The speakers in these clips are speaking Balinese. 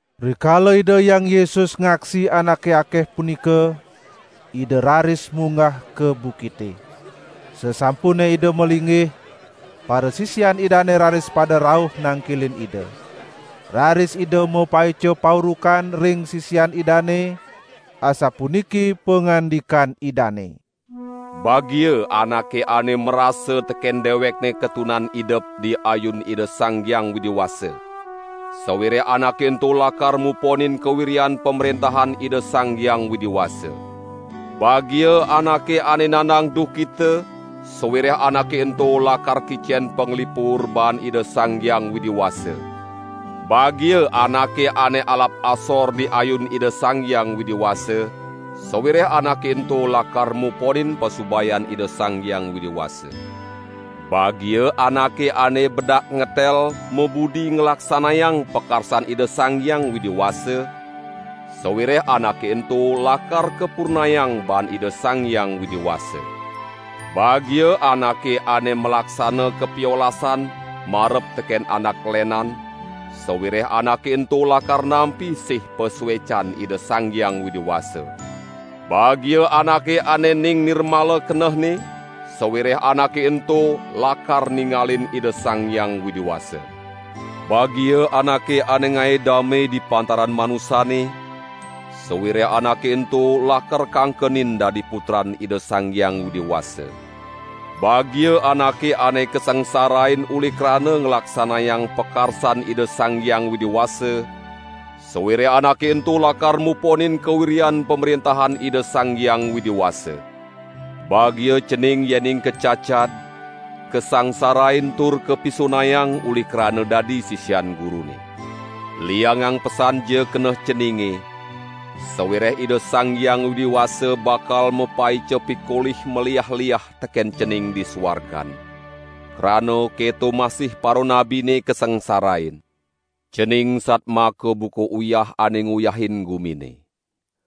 Rikala Ida Hyang Yesus ngaksi anake akeh punika, Ida raris munggah ka bukite. Sasampune Ida malinggih, parasisian Idane raris pada rauh nangkilin Ida. Raris Ida mapaica paurukan ring sisian Idane, asapuniki pangandikan Idane: "Bagia anake ane marasa teken dewekne katunan idep di ayun Ida Sang Hyang Widi Wasa, sawireh anake ento lakar muponin kawiryan Pamrentahan Ida Sang Hyang Widi Wasa. Bagia anake ane nandang duhkita, sawireh anake ento lakar kicen panglipur baan Ida Sang Hyang Widi Wasa. Bagia anake ane alap asor di ayun Ida Sang Hyang Widi Wasa, sawireh anake ento lakar muponin pasubayan Ida Sang Hyang Widi Wasa. Bagia anake ane bedak ngetel mabudi nglaksanayang pakarsan Ida Sang Hyang Widi Wasa, sawireh anake ento lakar kapurnayang baan Ida Sang Hyang Widi Wasa. Bagia anake ane malaksana kapiolasan marep teken anak lenan, sawireh anake ento lakar nampi sih pasuecan Ida Sang Hyang Widi Wasa. Bagia anake ane ning nirmala kenehne, sawireh anake ento lakar ningalin Ida Sang Hyang Widi Wasa. Bagia anake ane ngae dame di pantaran manusane, sawireh anake ento lakar kangkenin dadi putran Ida Sang Hyang Widi Wasa. Bagia anake ane kasangsarain uli krana nglaksanayang pakarsan Ida Sang Hyang Widi Wasa, sawireh anake ento lakar muponin kawiryan Pamrentahan Ida Sang Hyang Widi Wasa. Bagia cening yening kacacad, kasangsarain tur kapisunayang uli krana dadi sisian Gurune. Liangang pesanja keneh ceninge, sawireh Ida Sang Hyang Widi Wasa bakal mapaica pikolih maliah-liah teken cening di suargan. Krana keto masih paranabine kasangsarain." "Cening satmaka buka uyah ane nguyahin gumine.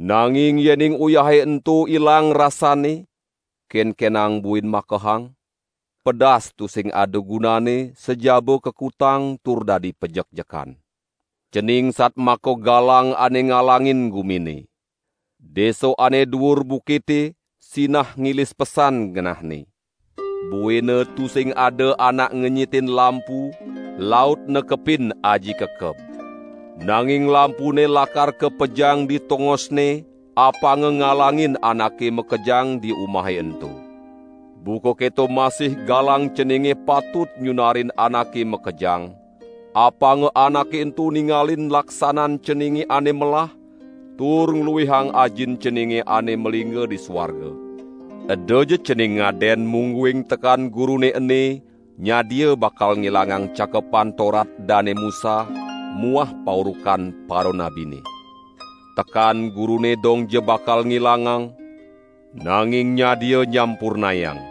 Nanging yening uyahe ento ilang rasanne, kenkenang buin makehang? Pedas tusing ada gunanne sajaba kakutang tur dadi pajekjekan. Cening satmaka galang ane ngalangin gumine. Desa ane duur bukite sinah ngilis pesan ngenahne. Buina tusing ada anak ngenyitin lampu laut nekepin aji kekeb. Nanging lampune lakar kapejang di tongosne, apanga ngalangin anake makejang di umahe ento. Buka keto masih galang ceninge patut nyunarin anake makejang, apanga anake ento ningalin laksanan ceninge ane melah tur ngluihang Ajin ceninge ane malingga di suarga." "Edaja cening ngaden mungguing tekan Gurune ene nyadia bakal ngilangang Cakepan Torat Dane Musa muah paurukan paranabine. Tekan Gurune dongja bakal ngilangang, nanging nyadia nyampurnayang.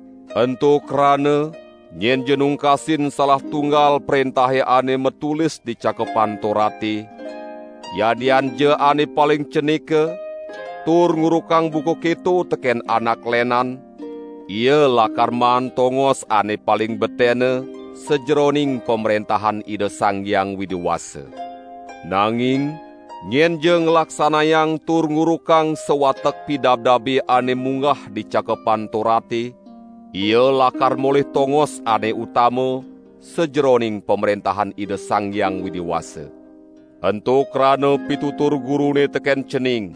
Ento krana nyenja nungkasin salah tunggal prentahe ane matulis di Cakepan Torate, yadianja ane paling cenika, tur ngurukang buka keto teken anak lenan, ia lakar maan tongos ane paling betene sajeroning Pamrentahan Ida Sang Hyang Widi Wasa. Nanging nyenja nglaksanayang tur ngurukang sawatek pidabdabe ane munggah di Cakepan Torate, ia lakar molih tongos ane utama sajeroning Pamrentahan Ida Sang Hyang Widi Wasa. Ento krana pitutur Gurune teken cening: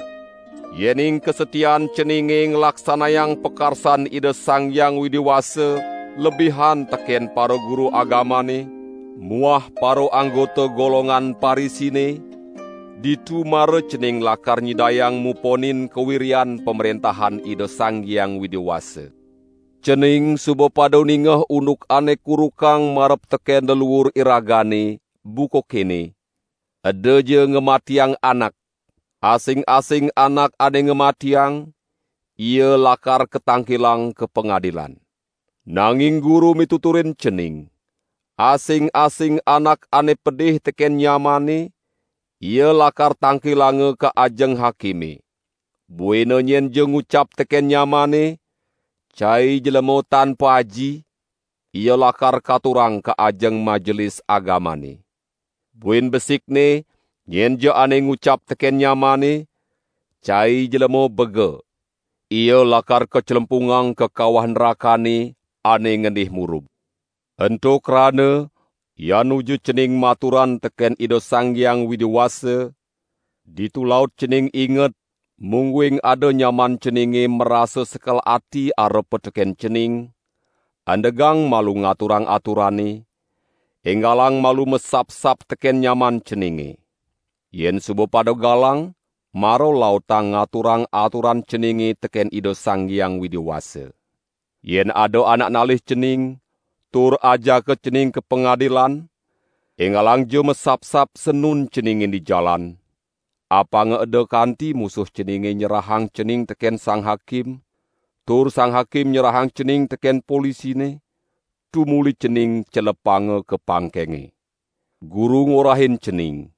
Yening kasatiaan ceninge nglaksanayang pakarsan Ida Sang Hyang Widi Wasa lebihan teken paraguru agamane muah paraanggota golongan Parisine, ditu mara cening lakar nyidayang muponin kawiryan Pamrentahan Ida Sang Hyang Widi Wasa." "Cening suba pada ningeh unduk ane kurukang marep teken leluur iragane, buka kene: 'Edaja ngamatiang anak, asing-asing anak ane ngamatiang, ia lakar katangkilang ka pangadilan.' Nanging Guru mituturin cening: Asing-asing anak ane pedih teken nyamanne, ia lakar tangkilanga ka ajeng hakime. Buina nyenja ngucap teken nyamanne: Cai jlema tan paaji! ia lakar katurang ka ajeng Majelis Agamane. Buin besikne nyenja ane ngucap teken nyamanne: Cai jlema bega! ia lakar kaclempungang ka kawah nrakane, ane ngendih murub. Ento krana yan nuju cening maturan teken Ida Sang Hyang Widi Wasa, ditu laut cening inget, mungguing ada nyaman ceninge marasa sekel ati arepa teken cening, andegang malu ngaturang aturane, enggalang malu masapsap teken nyaman ceninge. Yen suba pada galang, mara lautang ngaturang aturan ceninge teken Ida Sang Hyang Widi Wasa. Yen ada anak nalih cening, tur ajaka cening ka pangadilan, enggalangja masapsap sanun ceninge di jalan! Apanga eda kanti musuh ceninge nyerahang cening teken sang hakim, tur sang hakim nyerahang cening teken polisine, tumuli cening celepanga ka pangkenge. Guru ngorahin cening: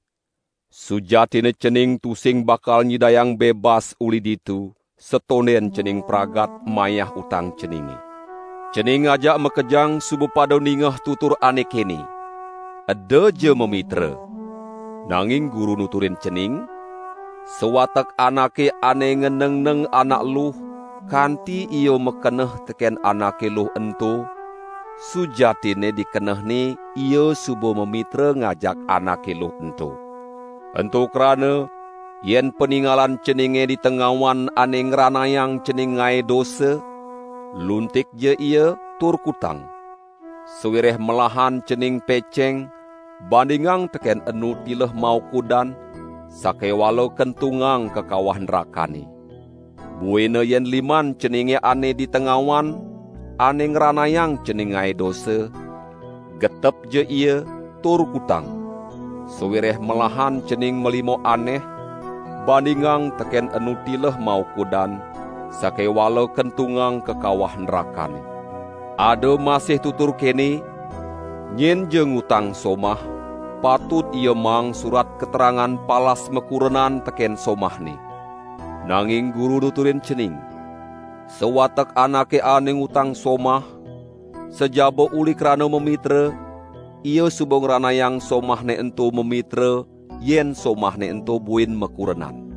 Sujatinne cening tusing bakal nyidayang bebas uli ditu, satonden cening pragat mayah utang ceninge." "Cening ajak makejang suba pada ningeh tutur ane kene: 'Edaja mamitra.' Nanging Guru nuturin cening: Sawatek anake ane nganengneng anak luh kanti ia makeneh teken anake luh ento, sujatinne di kenehne ia suba mamitra ngajak anake luh ento. Ento krana yen paningalan ceninge di tengawan ane ngranayang cening ngae dosa, luntikja ia tur kutang! Sawireh melahan cening peceng, bandingang teken enu tileh maukudan, sakewala kentungang ka kawah nrakane. Buina yen liman ceninge ane di tengawan ane ngranayang cening ngae dosa, getepja ia, tur kutang! Sawireh melahan cening malima aneh, bandingang teken enu tileh maukudan sakewala kentungang ka kawah nrakane." "Ada masih tutur kene: 'Nyenja ngutang somah, patut ia maang surat katerangan palas makurenan teken somahne.' Nanging Guru nuturin cening: Sawatek anake ane ngutang somah, sajaba uli krana mamitra, ia suba ngranayang somahne ento mamitra yen somahne ento buin makurenan.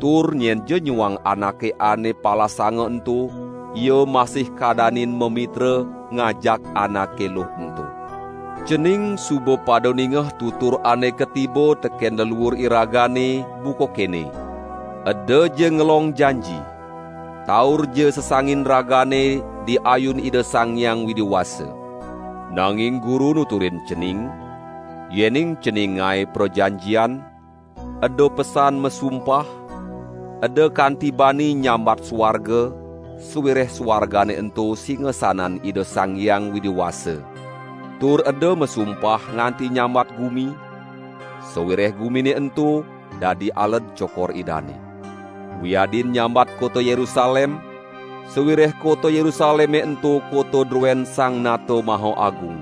Tur nyenja nyuang anake ane palasanga ento, ia masih kadanin mamitra ngajak anake luh ento." "Cening suba pada ningeh tutur ane katiba teken leluur iragane, buka kene: 'Edaja ngelong janji! Taurja sesangin ragane di ayun Ida Sang Hyang Widi Wasa.' Nanging Guru nuturin cening: Yening cening ngae prajanjian, eda pesan masumpah, eda kanti bani nyambat suarga sawireh suargane ento singasanan Ida Sang Hyang Widi Wasa; tur eda masumpah nganti nyambat gumi, sawireh gumine ento dadi aled cokor Idane. Wiadin nyambat kota Yerusalem, sawireh kota Yerusaleme ento kota druen Sang Nata Maha Agung.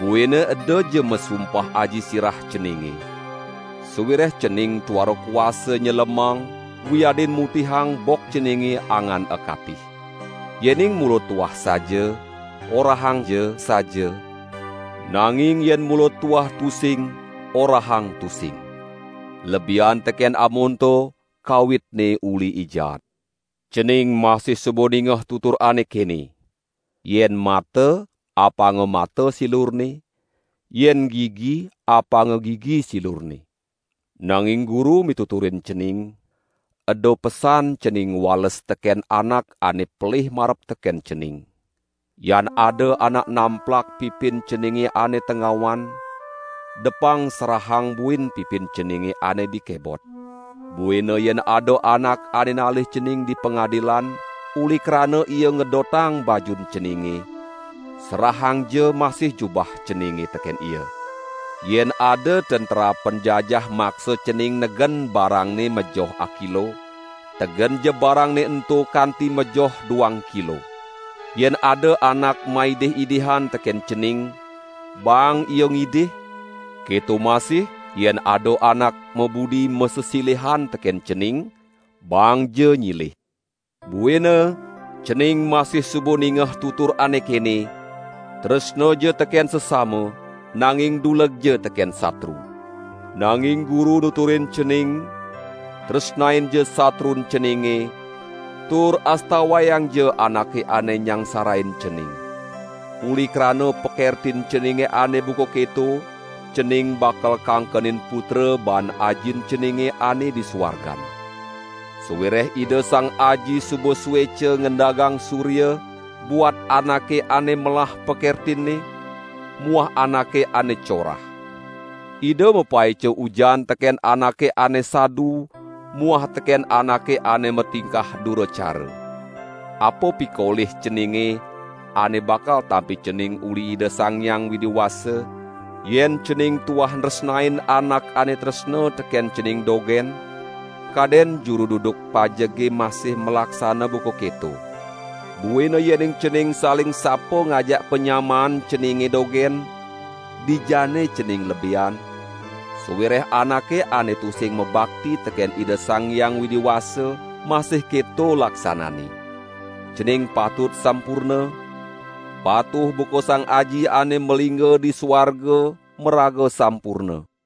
Buina edaja masumpah aji sirah ceninge! Sawireh cening tuara kuasa nyelemang wiadin mutihang bok ceninge angan akatih. Yening mula tuah saja, orahangja saja, nanging yen mula tuah tusing, orahang tusing! Lebihan teken amonto kawitne uli I Jaat." "Cening masih suba ningeh tutur ane kene: 'Yen mata, apanga mata silurne, yen gigi apanga gigi silurne.' Nanging Guru mituturin cening: Eda pesan cening ngwales teken anak ane pelih marep teken cening! Yan ada anak namplak pipin ceninge ane tengawan, depang serahang buin pipin ceninge ane di kebot. Buina yen ada anak ane nalih cening di pangadilan, uli krana ia ngedotang bajun ceninge, serahangja masih jubah ceninge teken ia. Yen ada tentera penjajah maksa cening negen barangne majoh akilo, tegenja barangne ento kanti majoh duang kilo. Yen ada anak maidih-idihan teken cening, baang ia ngidih, keto masih yen ada anak mabudi masesilihan teken cening, baangja nyilih." "Buina, cening masih suba ningeh tutur ane kene: 'Tresnaja teken sesama, nanging dulegja teken satru.' Nanging Guru nuturin cening: Tresnainja satrun ceninge, tur astawayangja anake ane nyangsarain cening. Uli krana pakertin ceninge ane buka keto, cening bakal kangkenin putra baan Ajin ceninge ane di suargan. Sawireh Ida Sang Aji suba sueca ngendagang surya buat anake ane melah pakertinne muah anake ane corah. Ida mapaica ujan teken anake ane sadu muah teken anake ane matingkah dura cara. Apa pikolih ceninge ane bakal tampi cening uli Ida Sang Hyang Widi Wasa, yen cening tuah nresnain anak ane tresna teken cening dogen? Kaden juru duduk pajege masih malaksana buka keto. Buina yening cening saling sapa ngajak panyamaan ceninge dogen, dijanne cening lebihan? Sawireh anake ane tusing mabakti teken Ida Sang Hyang Widi Wasa masih keto laksananne. Cening patut sampurna, patuh buka Sang Aji ane malingga di suarga maraga sampurna."